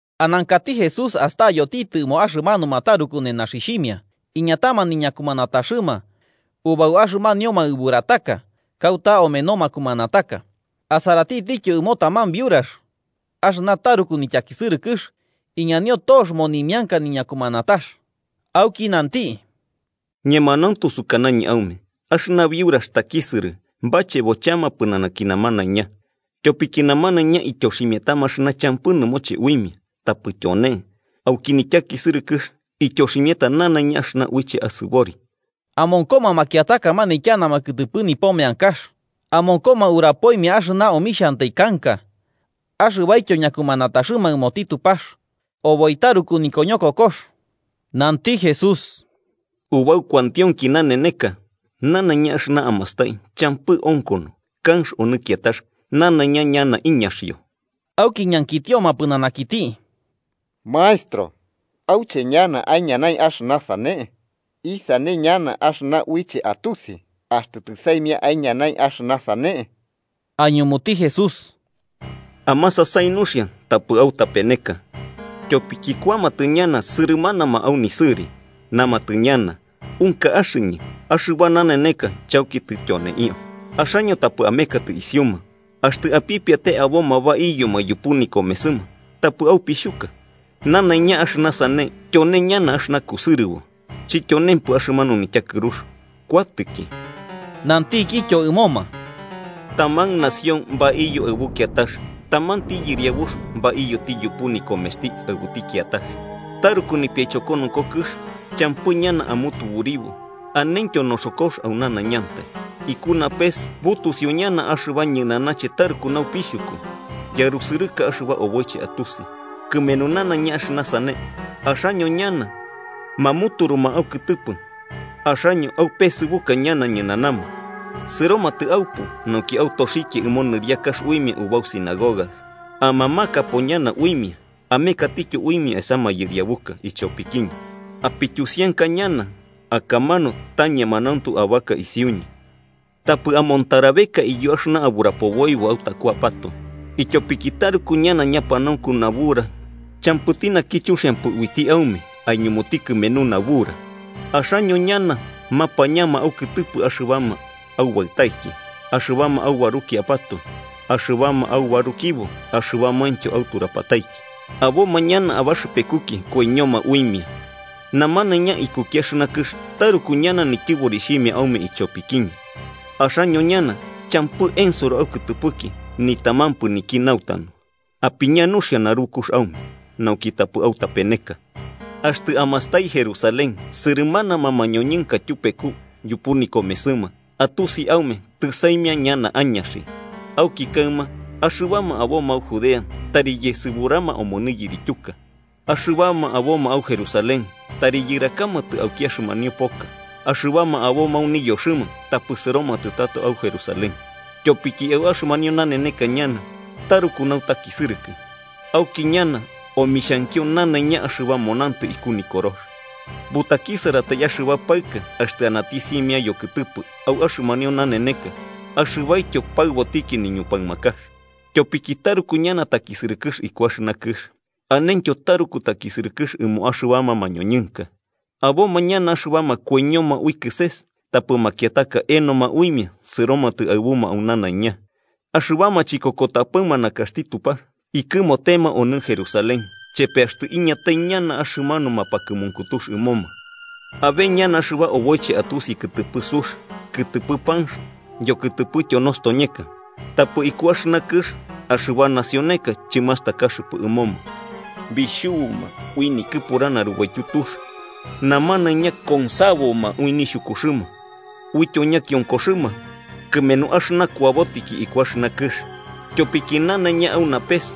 Anankati Jesús astayotitɨ ɨmo axɨmanuma taruku nenaxixhimia iñatama niñakumanataxɨma ubau axɨmanio maɨburataka kauta omeno makumanataka, asaratitityo ɨmo taman biurax axɨna taruku nityakisɨrɨkɨx iñanio tox monimianka niñakumanatax. Auki nanti: –Ñemanauntu sukanañɨ aume axɨna biurax takisɨrɨ bachebo chama pɨnanaki namanaiña. Tyopiki namanaiña ityoximiatama axɨna champɨ nɨmoche uimia, tapɨ tyone, auki nityakisɨrɨkɨx, ityoximiata nanaiña axɨna uiche asɨbori. Amonkoma makiataka manityanama kɨtɨpɨ nipo meankax, amonkoma urapoimia axɨna omixhantai kanka axɨbaityo ñakumanataxɨma ɨmoti Tupax oboi taruku nikoñokokox. Nanti Jesús: 6–Ubau kuantionki naneneka nanaiña axɨna amastai champɨ onkono kanx onɨ kiatax. Nanaiña ñana iñaxio. Auki ñankitioma pɨnanakiti: –Maestro, ¿auche ñana aiñanai axɨna sane? ¿Isane ñana axɨna uiche atusi axtɨ tɨsaimia aiñanai axɨna sane? Aiñumuti Jesús: “Amasasai nuxia tapɨ autapeneka. Tyopiki kuamatɨ ñana sɨrɨmanama au nisɨri. Namatɨ ñana: ‘Unka axɨñɨ’, ‘axɨba naneneka chauki tɨtyoneio’ Axaño tapɨ amekatɨ isiuma. Axtɨ apipiate aboma baiyoma yupu nikomesɨma, tapɨ aupixhuka, nanaiña axɨna sane tyone ñana axɨna kusɨrɨbo. Chityonempɨ, axɨmanu nityakɨrux kuatɨki.” Nantikityo ɨmoma: “Taman nación baiyo aɨbu kiatax tamanti yɨriabux baiyoti yupu nikomesti aɨbuti kiatax. Taruku nipiaichokonoko kɨx, champɨ ñana amutuburio anentyo noxokox au nanaiñantai, iku napes butusiu ñana axɨba ñɨnanache taruku napixhuku yarusɨrɨka axɨba oboiche atusi. “Kɨmenu nanaiña axɨna sane, axaño ñana mamuturuma aukɨtɨpɨ axaño aupesɨbuka ñana ñɨnanama. Sɨromatɨ aupu nauki autoxikia ɨmo nɨriakax uimia ubau sinagogas, amamakapo ñana uimia amekatityo uimia esa mayɨriabuka ichopikiñɨ. Apityusianka ñana akamanu ta ñemanauntu abaka isiuñɨ. Tapɨ amontarabeka iyo axɨna aburapoboibo autakuapatoe, ityopiki taruku ñana ñapanaunku nabura champɨti naki chuxiampɨ uiti aume aiñumuti kɨmenu nabura. Axaño ñana mapañama aukɨtɨpɨ axɨbama aubaɨtaiki, axɨbama aubarukiapatoe, axɨbama abarukibo axɨbamaintyo auturapataiki. Aboma ñana abaxɨpekuki koiñoma uimia, namanaiña ikuki axɨna kɨx taruku ñana nityɨborixhimia aume ichopikiñɨ. Axaño ñana champɨ ensoro aukɨtɨpɨki nitamampɨ niki nautanu. ¡Apiña nuxia narukux aume, nauki tapɨ autapeneka! “Axtɨ amastai Jerusalén sɨrɨmanama mañoñɨnka tyupeku yupu nikomesɨma, atusi aume tɨsaimia ñana añaxi. Auki kaɨma, axɨbama aboma au Judea, tari yesɨburama omonɨ yirityuka. Axɨbama aboma au Jerusalén, tari yɨrakamatɨ ubauki axɨmanio poka, axɨbama aboma au niyoxɨma, tapɨ sɨromatɨ tato au Jerusalén. Tyopiki au axɨmanio naneneka ñana taruku nautakisɨrɨkɨ, auki ñana omixhankio nanaiña axɨba monantɨ iku Nikorox. ¡Butakisɨratai axɨba paɨka axtɨ anati simia yokɨtɨpɨ au axɨmanio naneneka axɨbaityo paɨbotiki niñupaɨmakax! Tyopiki taruku ñana takisɨrɨkɨx iku axɨna kɨx, anentyo taruku takisɨrɨkɨx ɨmo axɨbama mañoñɨnka. Aboma ñana axɨbama koiñoma ui kɨses tapɨ makiataka enoma uimia sɨromatɨ aɨbuma au nanaiña. Axɨbama chikokotapɨma nakaxti Tupax ikɨmotema onɨ Jerusalén chepe axtɨ iñatai ñana axɨmanu mapakɨmunkutux ɨmoma. “Abe ñana axɨba oboiche atusi kɨtɨpɨ sux, ikɨtɨpɨ panx yokɨtɨpɨtyo nostoñeka. Tapɨ iku axɨna kɨx axɨba nacioneka chɨmastakaxɨpɨ ɨmoma bixhubuma ui nikɨpura narubaityu tux. Namanaiña consaboma ui nixhukuxɨma uityo ñakionkoxɨma kɨmenu axɨna kuabotiki iku axɨna kɨx. Tyopiki nanaiña au napes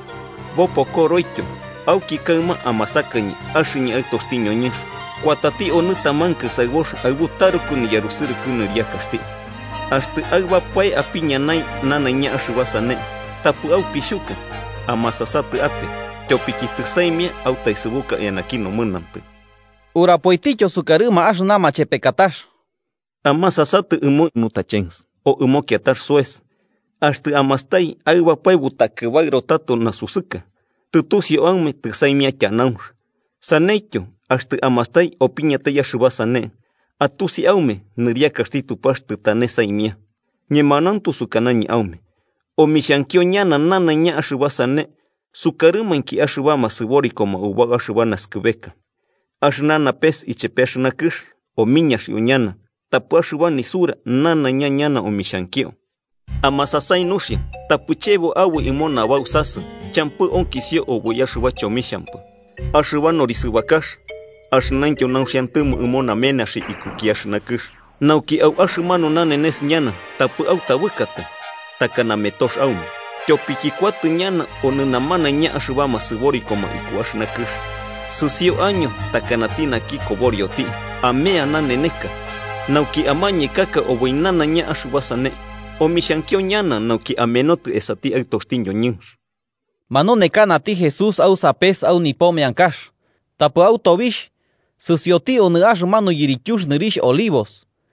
bopokoroityo. Auki kaɨma amasakañɨ axɨñɨ Aɨtoxti ñoñɨnx kuatati onɨ taman kɨsaɨbox aɨbu taruku niyarusɨrɨkɨ nɨriakaxti. Axtɨ aɨbapae apiñanai nanaiña axɨba sane, tapɨ aupixhuka amasasatɨ ape, tyopiki tɨsaimia autaesɨbuka eanaki nomɨnantɨ.” Urapoitityo sukarɨma axɨna machepekatax: “Amasasatɨ ɨmo higuera, o ɨmo kiatax soes. Axtɨ amastai aɨbapae butakɨbaɨro tato nasusɨka, tɨtusiu aume tɨsaimia tyanaunx. Saneityo, axtɨ amastai opiñatai axɨba sane, atusi aume nɨriakaxti Tupax tɨtane saimia. “Ñemanauntu sukanañɨ aume omixhankio ñana nanaiña axɨba sane sukarɨmainki axɨbama sɨborikoma ubau axɨba naskɨbeka. Axɨna napes ichepe axɨna kɨx omiñaxio ñana, tapɨ axɨba nisura nanaiña ñana omixhankio. “Amasasai nuxia tapɨ chebo aboi ɨmo nabausasɨ champɨ onkisio oboi axɨba chomixhampɨ, axɨba norisɨbakax axɨnaintyo nauxiantɨmo ɨmo namenaxi iku axɨna kɨx, nauki au axɨmanu nanenes ñana tapɨ autabɨkatai takana metox aume. Tyopiki kuatɨ ñana onɨ namanaiña axɨbama sɨborikoma iku axɨna kɨx. Sɨsio año takanati naki koborioti, amea naneneka, nauki amañekaka oboi nanaiña axɨba sane omixhankio ñana nauki amenotɨ esati Aɨtoxti ñoñɨnx.” Manunekanati Jesús au sapes au nipo meankax, tapɨ au tobixh sɨsioti onɨ axɨmanu yirityux nɨrixh Olivos.